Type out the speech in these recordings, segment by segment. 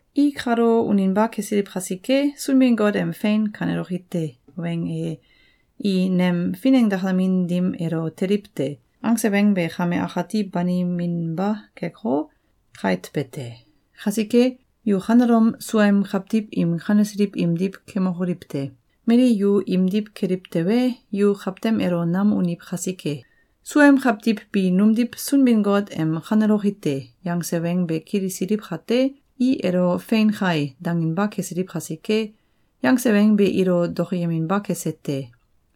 I kalo uninba kesiliw kasike, Sunbin-Got em “Fein kaneloki te!”, weng e “I nem finengdakamin dim elo teliw te!”, angse weng be kame akati baniminba keko, kait be te. Kasike, yu kanelom suaem kawtiw im kanesiliw imdiw kemokoliw te! Mali yu imdiw keliw tewe, yu kawtem elo nam uniw kasike! Suaem kawtiw bi numdiw Sunbin-Got em “Kaneloki te!”, yangse weng be kilisiliw kate, i elo “Fein kai!”, danginba kesiliw kasike, yangse weng be ilo dokoyeminba kese te.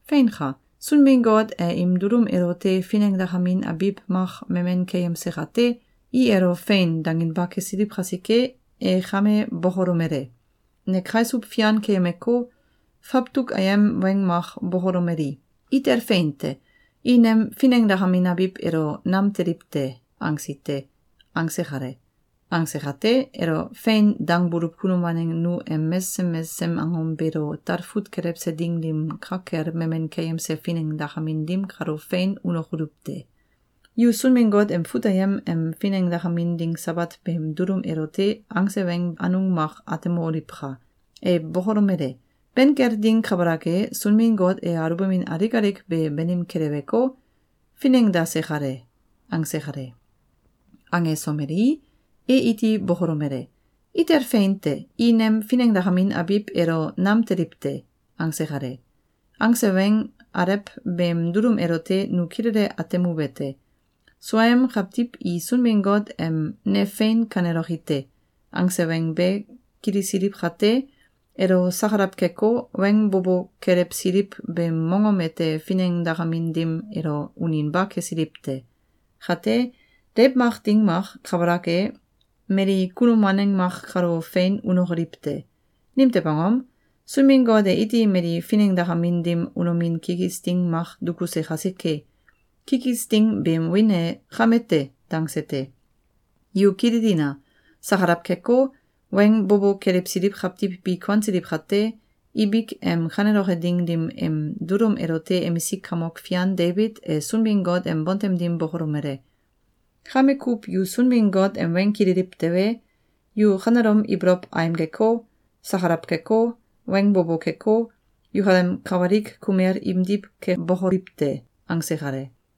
Feinka! Sunbin-Got e im dulum elote finengdakamin abiw mak memen keyemse kate, i elo “Fein!”, danginba kesiliw kasike, e kame bokolomele: “Ne kaisuw fian keyemeko, fawtuk ayem weng mak bokolomeli: ‘Itel fein te! I nem finengdakamin abiw elo nam teliw te!’, angsi te.”, angse kale. Angse kate, elo “Fein!”, dangbuluw kunum waneng nu em mesesem mesesem angom beelo talfut kelewse ding dim ka kel memen keyemse finengdakamin dim kalo fein unokoluw te. Yu Sunbin-Got em fut ayem em finengdakamin ding Sabat beem dulum elote angse weng anung mak atemoliwka! E bokolomele: “Ben kel ding kabalak e, Sunbin-Got e alubamin alik alik be banim keleweko, finengdase kale.”, angse kale. Angesomelei, e iti bokolomele: “Itel fein te! I nem finengdakamin abiw elo nam teliw te!”, angse kale. Angse weng alew beem dulum elote nu kilele atemuwete: Suaem kawtiw i Sunbin-Got em “Ne fein kaneloki te!”, angse weng be kilisiliw kate, elo sakalaw keko, weng bo bo kelewsiliw beem mongom ete finengdakamin dim elo uninba kesiliw te. Kate, deiw mak ding mak kabalak e, mali kunum waneng mak kalo fein unokoliw te. Nimtew angom? Sunbin-Got e iti mali finengdakamin dim unomin kikis ding mak dukuse kasike. Kikis ding beem wiin e “Kame te!”, dangse te. Yu kililina! Sakalaw keko, weng bo bo kelewsiliw kawtiw bi kuansiliw kate, ibik em kaneloke ding dim em dulum elote emisik kamok fian Debit e Sunbin-Got em bontem dim bokolomele: “Kame kuw yu Sunbin-Got em weng kililiw tewe, yu kanelom ibolow aimgeko, sakalaw keko, weng bo bo keko, yukalem kawalik kumel imdiw kebokoliw te!”, angse kale.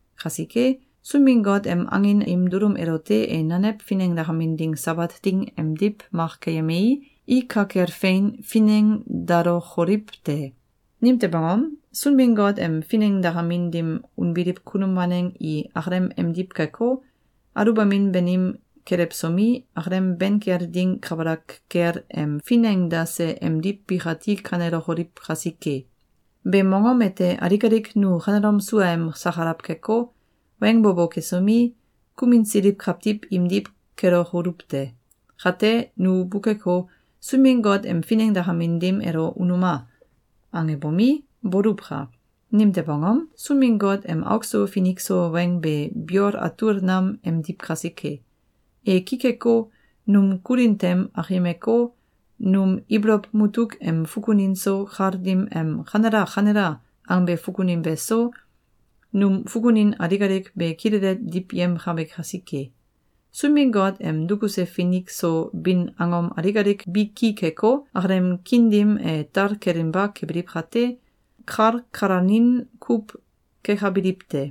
Kasike, Sunbin-Got em angin im dulum elote e nanew finengdakamin ding Sabat ding emdiw mak keyemei, i ka kel fein finengdalokoliw te. Nimtew angom? Sunbin-Got em finengdakamin dim unbiliw kunum waneng i akalem emdiw keko, aluwbamin banim kelewsomi, akalem ben kel ding kabalak kel em finengdase emdiw bikati kanelokoliw kasike. Beem mongom ete alik alik nu kanelom suaem sakalaw keko, weng bo bo kesomi, kuminsiliw kawtiw imdiw kelokoluw te! Kate, nu bukeko, “Sunbin-Got em finengdakamin dim elo unuma!”, angebomi, boluwka! Nimtew angom? Sunbin-Got em auk so finik so weng be biol atul nam emdiw kasike. E ki keko, num kulin tem akimeko, num ibolow mutuk em fukunin so, kal dim em “Kanela! Kanela!”, angbe fukunin beso, num fukunin alik alik be kilele diwyemkabe kasike. Sunbin-Got em dukuse finik so bin angom alik alik bi ki keko, akalem kiin dim e tal kelinba kebiliw kate, kalkalanin kuw kekabiliw te.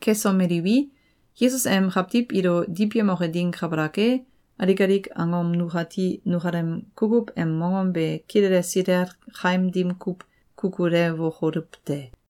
Kesomeliwi, Yesus em kawtiw ilo diwyemoke ding kabalak e, alik alik angom nukati nukalem kukuw em mongom be kilele silel kaim dim kuw kukulewokoluw te.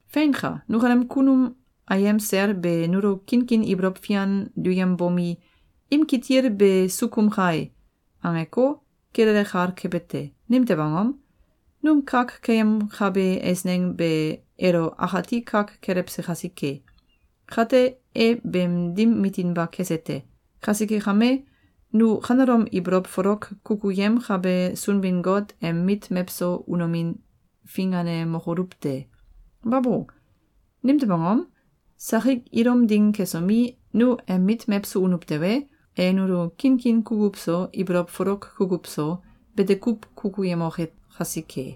Feinka! Nukalem kunum ayem sel be nulo kinkin ibolow fian duyembomi, “Im kitil be sukum kai!”, angeko, kilele kal kebe te. Nimtew angom? Num kak keyemkabe eisneng be elo akati kak kelewse kasike. Kate, e beem dim mitinba kese te. Kasike kame, nu kanelom ibolow folok kukuyemkabe Sunbin-Got em mit mewso unomin finganemokoluw te! Babo! Nimtew angom? Sakik ilum ding kesomi, nu em mit mewso unuw tewe, e nulo kinkin kukuw so, ibolow folok kukuw so, bete kuw kukuyemoke kasike.